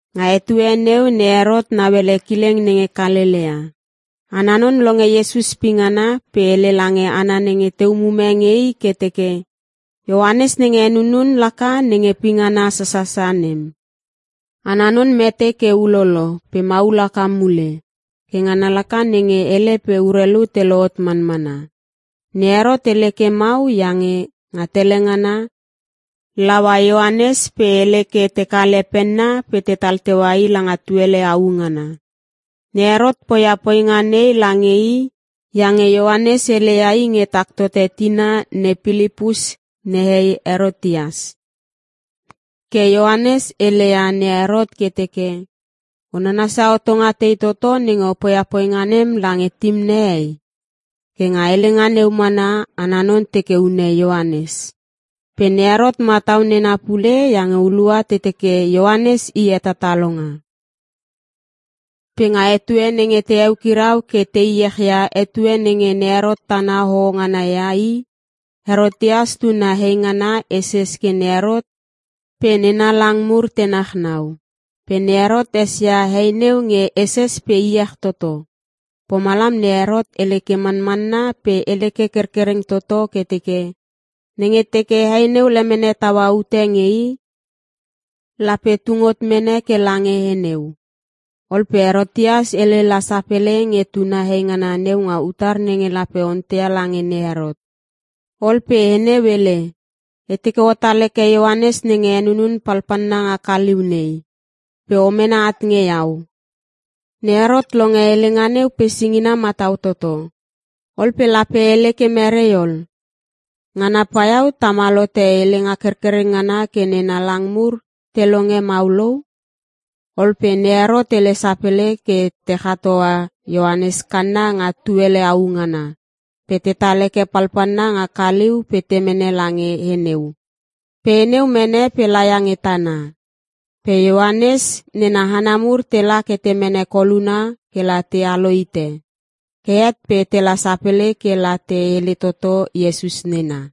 Nga etue neu ne Herot nauele kileng nenge Kalelea. Ana non longe Iesus pingana, pe hele lange hana nenge te umume nge i ke teke, “Ioanes nenge henunun laka nenge pingana sasasa nem. Ana non mete ke ulolo pe maul haka mule. Ke ngana laka nenge hele pe urelu te lohot manmana.” Ne Herot hele ke mau iange nga tele ngana, laua Ioanes pe hele ke te kale penna pe tetal teua i langa tuele au ngana. Ne Herot poia poinga nei lange i iange Ioanes heleia i nge tak tote tina ne Pilipus nehei Herotias. Ke Ioanes heleia ne Herot ke teke, “O nanasia hotonga tei toto nenge o poia poinga nem lange tim nehei?” Ke nga helenga neu mana, ana non teke hune Ioanes. Pe ne Herot matau nena pule iange hulua te teke Ioanes i hetatalonga. Pe nga etue nenge te eukirau ke te iech ia etue nenge ne Herot tana hoho ngana ia I, Herotias tuna heingana heses ke ne Herot pe nena lang mur te nachnau. Pe ne Herot esia he neu nge heses pe iech toto. Pomalam ne Herot hele ke manmanna pe hele ke kerkereng toto ke teke, nenge teke he neu lemene taua ute e nge i, lape tung hot mene ke lange he neu. Ol pe Herotias hele la sapele nge tuna heingana neu nga utar nenge lape onteia lange ne Herot. Ol pe he neu hele, “E teke otal heke Ioanes nenge henunun palpalna nga kaliu nei pe o mene at nge iau.” Ne Herot longe helenga neu pe singina matau toto. Ol pe lape hele ke merei ol? Ngana paiau tamal hote helenga kerkereng ngana ke nena lang mur te longe mau lou. Ol pe ne Herot hele sapele ke te chat hoa Ioanes kanna nga tuele au ngana pe tetal heke palpalna nga kaliu pe te mene lange he neu. Pe he neu mene pe laia nge tana. Pe Ioanes nena hana mur tela ke te mene koluna ke la te alo hite. Ke het pe tela sapele ke la te hele toto Iesus nena.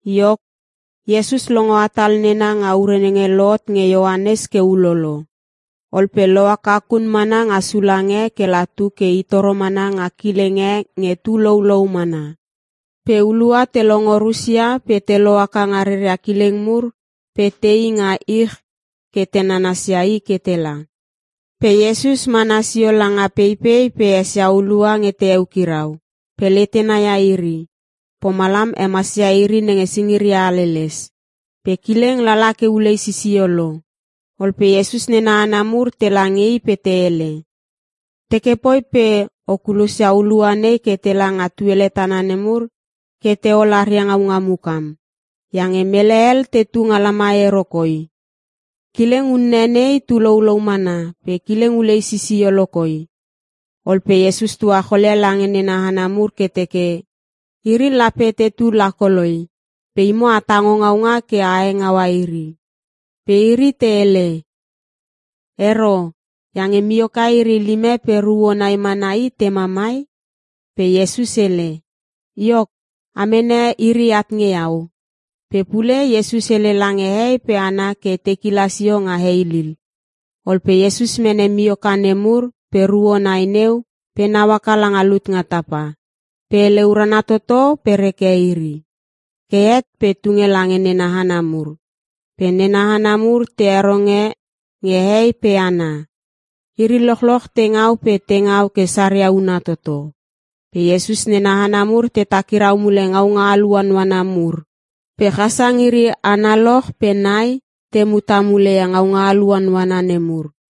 Iok, Iesus longo hatal nena nga ure nenge lohot nge Ioanes ke ulolo. Ol pe lohaka kun mana nga sulang e ke la tu ke I toro mana nga kileng e nge tu loulou mana. Pe hulua te longo rusia pe te lohaka nga reria kileng mur pe te i nga ich ke te nanasia I ke tela. Pe Iesus mana sio langa peipei pe esia hulua nge te eukirau, pe letena ia iri. Pomalam hemasia iri nenge singiria haleles. Pe kileng lala ke ulei sisio lo, ol pe Iesus nena hana mur tela nge I pe te hele, “Teke poi pe o kulosia hulua nei ke tela nga tuele tana nemur ke te ol aria ngaunga mukam. Iange mele hel tetu nga lamai ero koi. Kileng unne nei, tu loulou mana pe kileng ulei sisio lokoi.” Ol pe Iesus tuacholia lange nena hana mur ke teke, “Iri lape tetu lakoloi, pe imo a tango ngaunga ke a hengaua iri.” Pe iri te hele, “Ero! Iange mioka iri lime pe ruo nai mana i tema mai.” Pe Iesus hele, “Iok, a mene iri at nge Iau.” Pe pule Iesus hele lange hehei pe hana ke te kila sio nga heilil. Ol pe Iesus mene mioka nemur pe ruo nai neu pe nau haka langa lut nga tapa, pe hele urana toto pe reke iri. Ke het pe tunge lange nena hana mur. Pe nena hana mur te heronge nge hehei pe hana. Iri lochloch te ngau pe te ngau ke saria una toto. Pe Iesus nena hana mur te takirau mule ngaunga aluanuana mur. Pe chasang iri analoch pe nai, te muta mule ia ngaunga aluanuana nemur.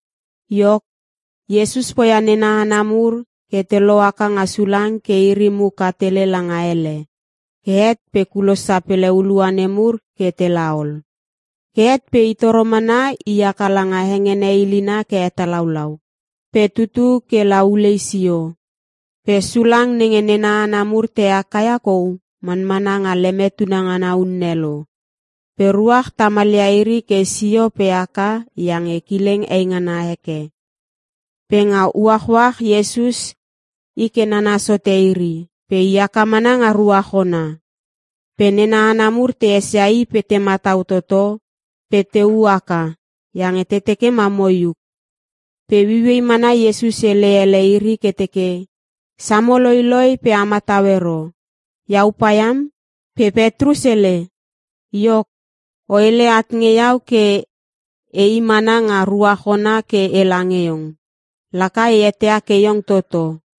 Iok, Iesus poia nena hana mur ke te lohaka nga sulang ke iri muka tele langa hele. Ke het pe kulos sapele hulua nemur ke tela ol. Ke het pe I toro mana i haka langa hengene ilina ke hetalaulau, pe tutu ke la ulei sio. Pe sulang nenge nena hana mur te haka ia kou manmana nga leme tunangana unne lo. Pe ruach tamal ia iri ke sio pe haka iange kileng eingana heke. Pe nga uachuach Iesus i ke nanas hote iri, pe i haka mana nga ruach ona. Pe nena hana mur te esia i pe te matau toto pe te u haka iange te teke ma moiuk. Pe ueiuei mana Iesus hele ele iri ke teke, “Samo loiloi pe a matau ero. Iau paiam.” Pe Petrus hele, “Iok, o hele at nge iau ke e i mana nga ruach ona ke ela nge iong. Laka e eteia ke iong toto.”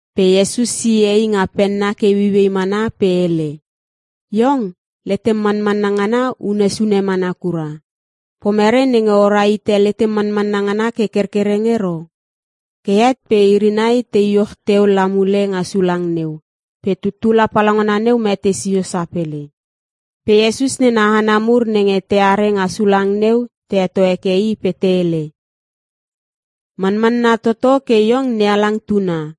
Pe Iesus sie i nga penna ke ueiuei mana pe hele, “Iong letem manmanna ngana unne sune mana kura. Pomerei nenge o ra hite letem manmanna ngana ke kerkereng ero?” Ke het pe iri nai te iuch teu la mule nga sulang neu, pe tuttula palaungana neu mete sio sapele. Pe Iesus nena hana mur nenge teare nga sulang neu te heto heke i pe te hele, “Manmanna toto ke iong NeHalang Tuna.”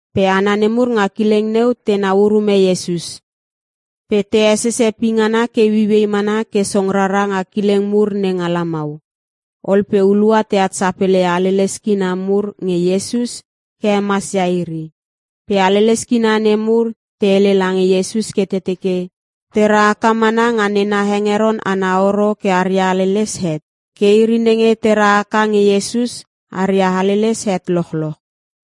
Pe hana nemur nga kileng neu tenau urume Iesus, pe te hesese pingana ke ueiuei mana ke song rara nga kileng mur nenga lamau. Ol pe hulua teat sapele ia haleles kina mur nge Iesus ke hemasia iri. Pe haleles kina nemur te hele lange Iesus ke te teke, te ra haka mana nga nena hengeron ana horo ke aria haleles het. Ke iri nenge te ra haka nge Iesus, aria haleles het lochloch.